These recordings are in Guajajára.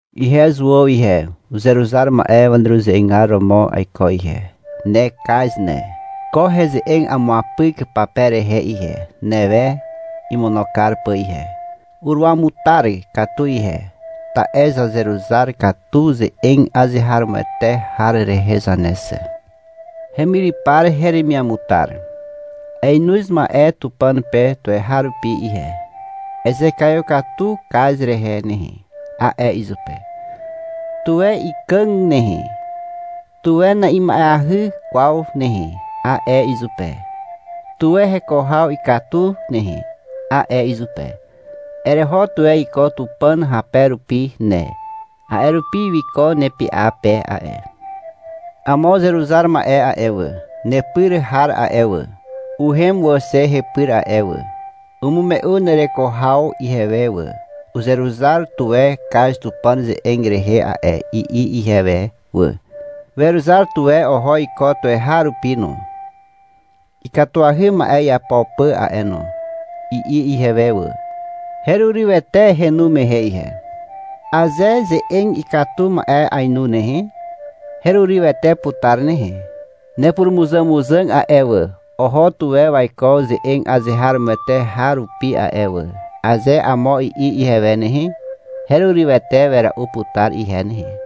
Ihe Zuàw ihe, uzeruzar ma'e waneruze'egar romo aiko ihe. Ne Kaz ne. Ko heze'eg amuapyk pape rehe ihe, newe imono kar pà ihe. Uruamutar katu ihe, ta'e zazeruzar katu ze'eg azeharomoete har rehe zane xe. Hemyrypar heremiamutar. Aenoz ma'e Tupàn pe tuweharupi ihe. — Ezekaiw katu Kaz rehe nehe, a'e izupe. — Tuwe ikàg nehe, tuwe na'ima'eahy kwaw nehe, a'e izupe. — Tuwe heko haw ikatu nehe, a'e izupe. Ereho tuwe iko Tupàn hape rupi ne. A'e rupi wiko nepy'a pe a'e. Amo uzeruzar ma'e a'e wà, nepyr har a'e wà, uhem wà xe hepyr a'e wà. Umume'u nereko haw ihewe wà. — Uzeruzar tuwe Kaz Tupàn ze'eg rehe a'e, i'i ihewe wà. — Weruzar tuwe oho iko tuweharupi no, ikatuahy ma'e iapo pà a'e no, i'i ihewe wà. Herurywete henu mehe ihe. Aze ze'eg ikatu ma'e ainu nehe, herurywete putar nehe. — Nepurumuzàmuzàg a'e wà, oho tuwe waiko ze'eg azeharomoete har rupi a'e wà, aze amo i'i ihewe nehe, herurywete wera'u putar ihe nehe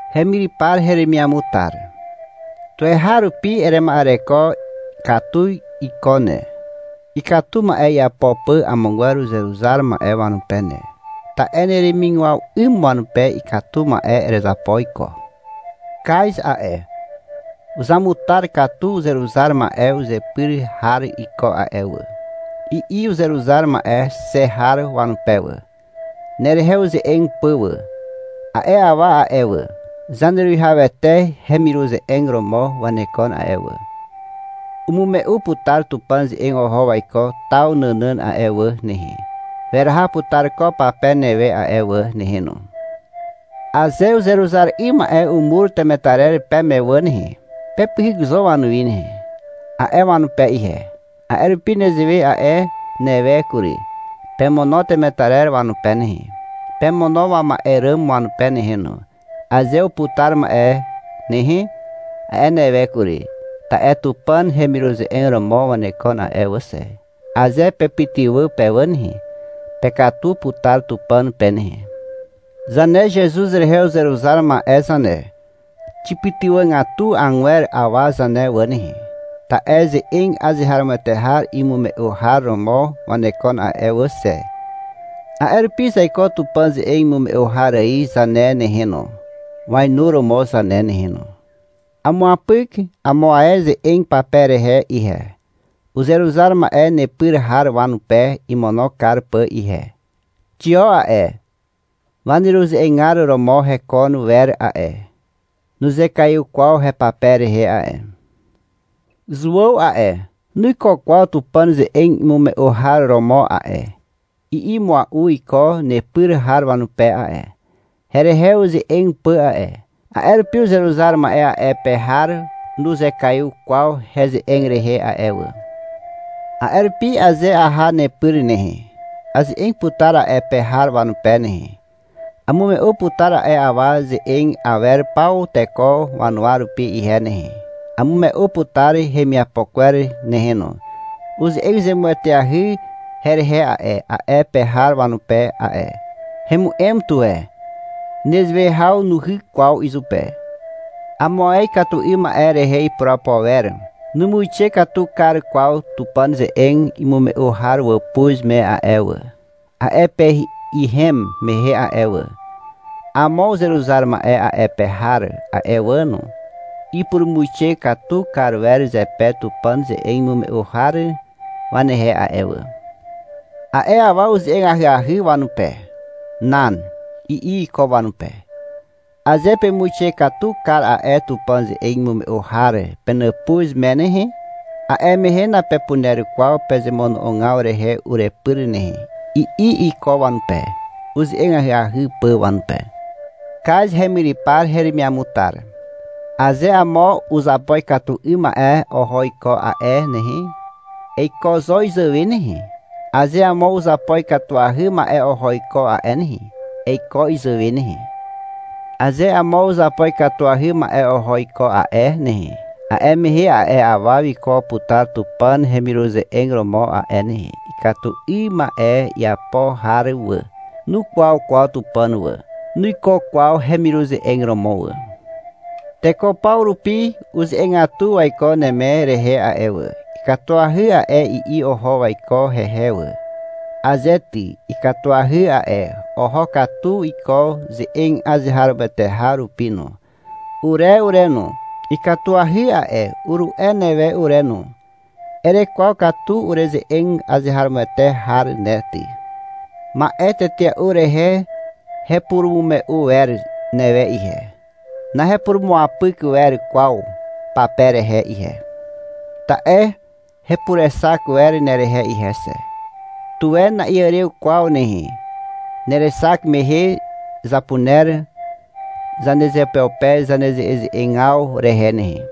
Hemyrypar heremiamutar. Tuweharupi erema'ereko katu iko ne, ikatu ma'e iapo pà amogwer uzeruzar ma'e wanupe ne. Te neremigwaw 'ym wanupe ikatu ma'e erezapo iko. — Kaz a'e, uzamutar katu uzeruzar ma'e uzepyr har iko a'e wà, i'i uzeruzar ma'e xe har wanupe wà, nerehe uze'eg pà wà. A'e awa a'e wà, Zaneruwihawete hemiruze'eg romo wanekon a'e wà. Umume'u putar Tupàn ze'eg oho waiko taw nànàn a'e wà nehe. Weraha putar ko pape newe a'e wà nehe no. — Aze uzeruzar 'ym ma'e umur temetarer peme wà nehe, pepyhyk zo wanuwi nehe, a'e wanupe ihe. A'e rupi nezewe a'e newe kury. — Pemono temetarer wanupe nehe, pemono wama'e ràm wanupe nehe no, aze uputar wà nehe, a'e newe kury. Ta'e Tupàn hemiruze'eg romo wanekon a'e wà xe. Aze pepytywà pe wà nehe, pekatu putar Tupàn pe nehe. Zane Zezuz rehe uzeruzar ma'e zane, xipytywàgatu agwer awa zane wà nehe, ta'e ze'eg azeharomoete har imume'u har romo wanekon a'e wà xe. A'e rupi zaiko Tupàn ze'eg imume'u har ài zane nehe no, wainuromo zane nehe no. Amuapyk amo ae heze'eg pape rehe ihe, uzeruzar ma'e nepyr har wanupe imono kar pà ihe. Xio a'e, waneruze'egar romo heko wer a'e. Nuzekaiw kwaw hepape rehe a'e. — Zuàw a'e, nuiko kwaw Tupàn ze'eg imume'u har romo a'e, i'i mua'u iko nepyr har wanupe a'e, herehe uze'eg pà a'e. (A'e rupi uzeruzar ma'e a'e pe har nuzekaiw kwaw heze'eg rehe a'e wà.) A'e rupi aze aha nepyr nehe, aze'eg putar a'e pe har wanupe nehe. Amume'u putar a'e awa ze'eg awer paw teko wanuwa rupi ihe nehe. Amume'u putar hemiapo kwer nehe no. Uze'eg zemueteahy herehe a'e, a'e pe har wanupe a'e. Hemu'em tuwe. Nezewe haw nuhyk kwaw izupe. Amo ae ikatu 'ym ma'e rehe ipurapo wer. Numuixe katu kar kwaw Tupàn ze'eg imume'u har wàpuz me a'e wà, a'e pe ihem mehe a'e wà. Amo uzeruzar ma'e a'e pe har a'e wà no, ipurumuixe katu kar wer zepe Tupàn ze'eg imume'u har wanehe a'e wà. A'e awa uze'eg ahyahy wanupe. — Nan, i'i iko wanupe. — Aze pemuixe katu kar a'e Tupàn ze'eg imume'u har penàpuz me nehe, a'e mehe napepuner kwaw pezemono'ogaw rehe urepyr nehe, i'i iko wanupe, uze'eg ahyahy pà wanupe. Kaz hemyrypar heremiamutar. Aze amo uzapo ikatu 'ym ma'e oho iko a'e nehe, eiko zo izàwe nehe. Aze amo uzapo ikatuahy ma'e oho iko a'e nehe, eiko izàwe nehe. Aze amo uzapo ikatuahy ma'e oho iko a'e nehe, a'e mehe a'e awa wiko putar Tupàn hemiruze'eg romo a'e nehe. Ikatu 'ym ma'e iapo har wà, nukwaw kwaw Tupàn wà, nuiko kwaw hemiruze'eg romo wà. Teko paw rupi uze'egatu waiko Neme rehe a'e wà. — Ikatuahy a'e, i'i oho waiko hehe wà. Aze ty, ikatuahy a'e. Oho katu iko ze'eg azeharomoete har rupi no. Ure ure no, — Ikatuahy a'e, uru'e newe ure no. Erekwaw katu ureze'eg azeharomoete har ne ty. Ma'e tetea'u rehe hepurumume'u wer newe ihe. Nahepurumuapyk wer kwaw pape rehe ihe. Ta'e hepurexak wer nerehe ihe xe. Tuwe na'iàrew kwaw nehe. Nerexak mehe zapuner zanezeupeupe zaneze'eze'egaw rehe nehe.